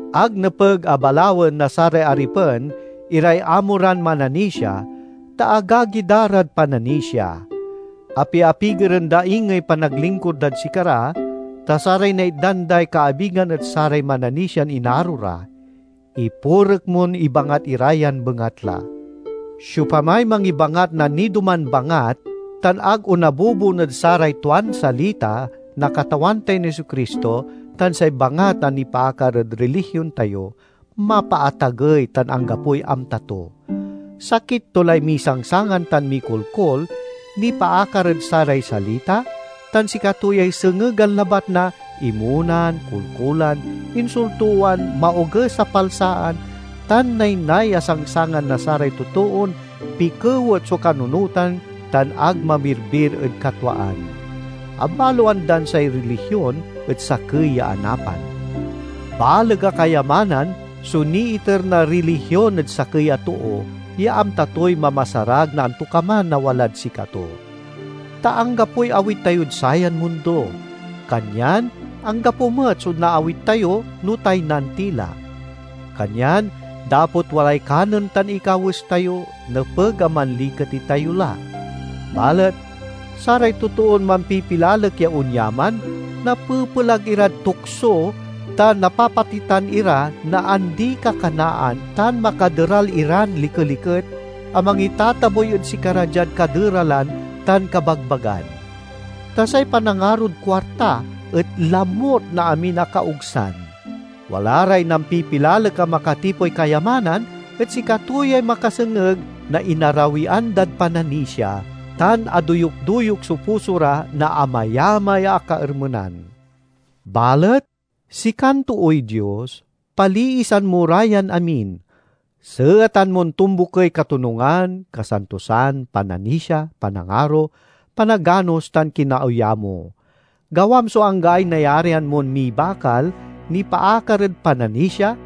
Ag nepeg a balawen na saray aripen iray amo ran mananisia, ta agagi da rad pananisia. Apiapigeren da ingey panaglingkur dad sikara, ta saray naitdan day kaabigan et saray mananisian inaro ra. Ipurek mon ibangat ira yan bengatla. Siopamay mangibangat na nidoman bangat tan ag onabubon ed saray tuan salita na Katawan tayon Jesu-Cristo tan say bangat a nipaakar ed rilihion tayo, mapaatagey tan anggapoy amta to. Sakit to lay misangsangan tan mikolkol nipaakar ed saray salita, tan sikato yay sengegan labat na imonan, kolkolan, insultowan, maoges a palsaan, tan naynay a sangsangan na saray totoon pikewet so kanunotan tan ag mamirbir ed katwaan. Abaloan dan say rilihion et sakey ya anapan. Baleg a kayamanan so niiter na rilihion ed sakey a too ya amta toy mamasarag na antokaman a walad sikato. Ta anggapoy awit tayod sayan mundo, kanyan anggapo met so naawit tayo no taynan ti la. Kanyan dapot walay kanen tan ikawes tayo, nepeg a manliket itayo la. Balet saray totoon mampipilalek ya onyaman, napepelag irad tukso tan napapatitan ira na andi-kakanaan tan makaderal iran likeliket a mangitatabuy ed sikara diad kaderalan tan kabagbagan. Ta say panangarod kuarta et lamut na amin a kaogsan. Wala ray nampipilalek a makatipoy kayamanan et sikato yay makasengeg na inarawian dad pananisia, tan adoyuk-doyuk so puso ra na amayamay a kaermenan. Balet sikan tooy Dios, paliisan mo ra yan amin. Seetan mon tombukey katonungan, kasantosan, pananisia, panangaro, panaganos, tan kinaoyamo. Gawam so anggaay nayarian mon mibakal nipaakar ed pananisia,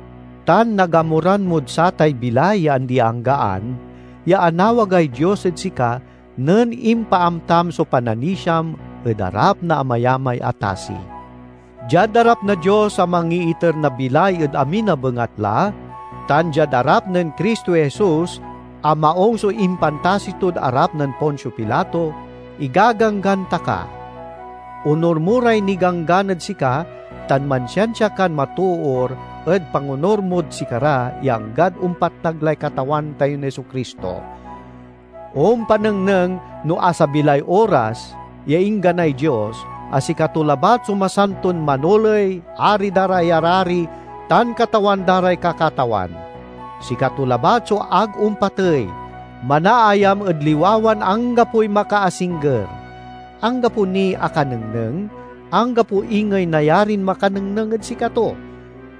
tan nagamuran mod satay bilay ya andi-anggaan ya anawagay Dios ed sika nen impaamtam so pananisiam ed arap na amayamay a tasi. Diad arap na Dios a mangiiter na bilay ed amin a bengatla, tan diad arap nen Cristo Jesus a maung so impantasi tod arap nen Poncio Pilato, igaganggan ta ka: Onur mo ray niganggan ed sika tan mansiansia kan matoor ed pangonur mod sikara ya anggad ompatnag lay Katawan tayon Jesu-Cristo. Ompanengneng no asabi lay oras ya ingganay Dios, a sikato labat so masanton Manoley, Ari da ray arari, tan Katawan da ray kakatawan. Sikato labat so ag ompatey; manaayam ed liwawan anggapoy makaasingger. Anggapo niy akanengneng, anggapo ingey nayarin makanengneng ed sikato.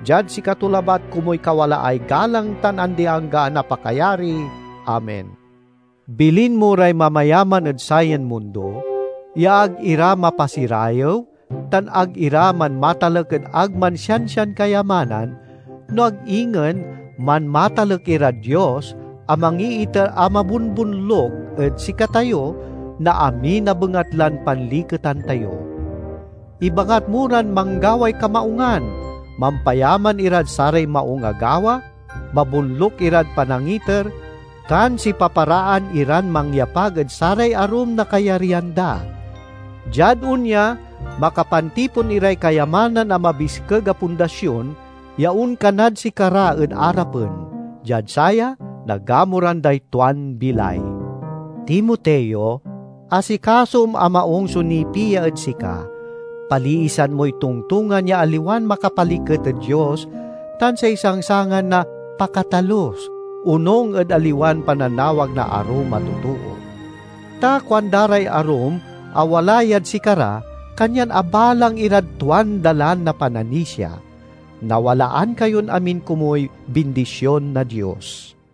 Diad sikato labat komuy kawalaay galang tan andi-anggaan a pakayari! Amen. Bilin mo ray mamayaman ed sayan mundo ya ag ira mapasirayew, tan ag ira manmatalek ed ag mansiansian kayamanan, no ag ingen manmatalek irad Dios a mangiiter a mabonbonluk ed sikatayo na amin a bengatlan panliketan tayo. Ibangat mo ran manggaway kamaungan, mampayaman irad saray maung a gawa, mabonluk irad panangiter, tan sipaparaan iran mangyapag ed saray arum na kayaryan da. Diad onya, makapantipon iray kayamanan a mabiskeg a pundasion ya onkanad sikara ed arapen. Diad saya nagamuran day tuan bilay. Timoteo, asikasom a maung so nipia ed sika. Paliisan moy tongtongan ya aliwan makapaliket ed Dios, tan say sangsangan na "Pakatalus," onung ed aliwan pananawag na arum a totoo. Ta kuanda ray arum a wala yad sikara, kanyan abalang irad tuan dalan na pananisia. Nawalaan kayon amin komuy bindision na Dios.